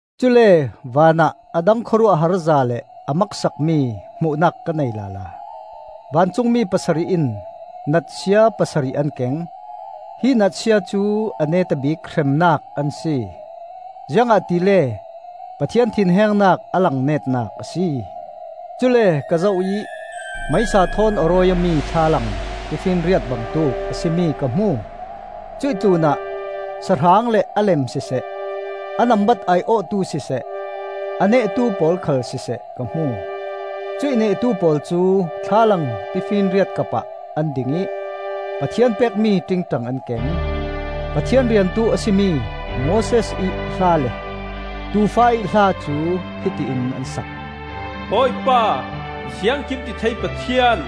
Cule vanah a dang khawruahharza le a maksakmi hmuhnak ka nei lala. Vancungmi pasarih in natsia pasarih an keng; hi natsia cu a neta bik hremnak an si, ziangahtile Pathian thinhengnak a lang netnak a si. Cule ka zoh ih meisa thawn a rawi awmi thlalang, tifinriat bangtuk a si mi ka hmu. Cuih tlunah sahrang le a lem siseh, a nambat ai-awhtu siseh, a nehtu pawl khal siseh ka hmu. Cuih nehtu pawl cu thlalang tifinriat kapah an ding ih Pathian pekmi ṭingṭang an keng. Pathian riantu a si mi Moses ih hla le Tuufa ih hla cu hiti in an sak: “Bawipa, Ziangkimtithei Pathian,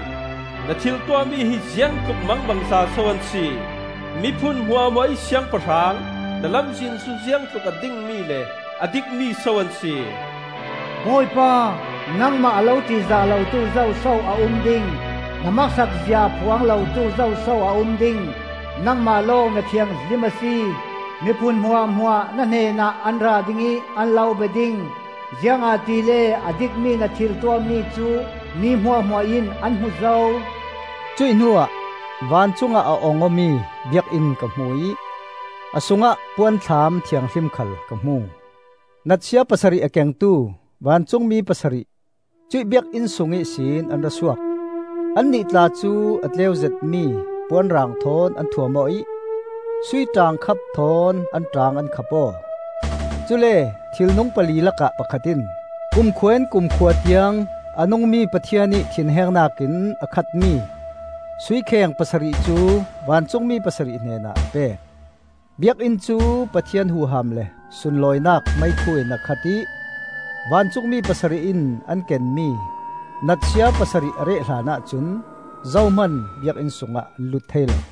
Na thiltuahmi hi ziangtluk mangbangza so an si. Miphun hmuahhmuahih Siangpahrang, Na lamzin cu ziangtluk a dingmi le a dikmi so an si. Bawipa, nangmah a lo ṭihzah lotu zoso a um ding? Na maksak zia a phuang lotu zoso a um ding? Nangmah lawng na thianghlim a si. Miphun hmuahhmuah na hnenah an ra ding ih an lo bia ding. Ziangahtile a dikmi na thil tuahmi cu mi hmuahhmuah in an hmu zo.” Cuih hnuah vancungah a ong awmi biakinn ka hmu ih a sungah Puanthlam Thianghlim khal ka hmu. Natsia pasarih a kengtu vancungmi pasarih cuih biakinn sung ihsin an ra suak; annih tla cu a tleu zetmi puanrang thawn an thuam aw ih sui ṭaangkhap thawn an ṭaang an khap aw. Cule thilnung pali lakah pakhat in kumkhua in kumkhua tiang a nungmi Pathian ih thinhengnak in a khatmi sui kheng pasarih cu vancungmi pasarih hnenah a pek. Biakinn cu Pathian huham le sunlawinak meikhu in a khat ih vancungmi pasarih in an kenmi natsia pasarih a reh hlanah cun zohman biakinn sungah an lut thei lo.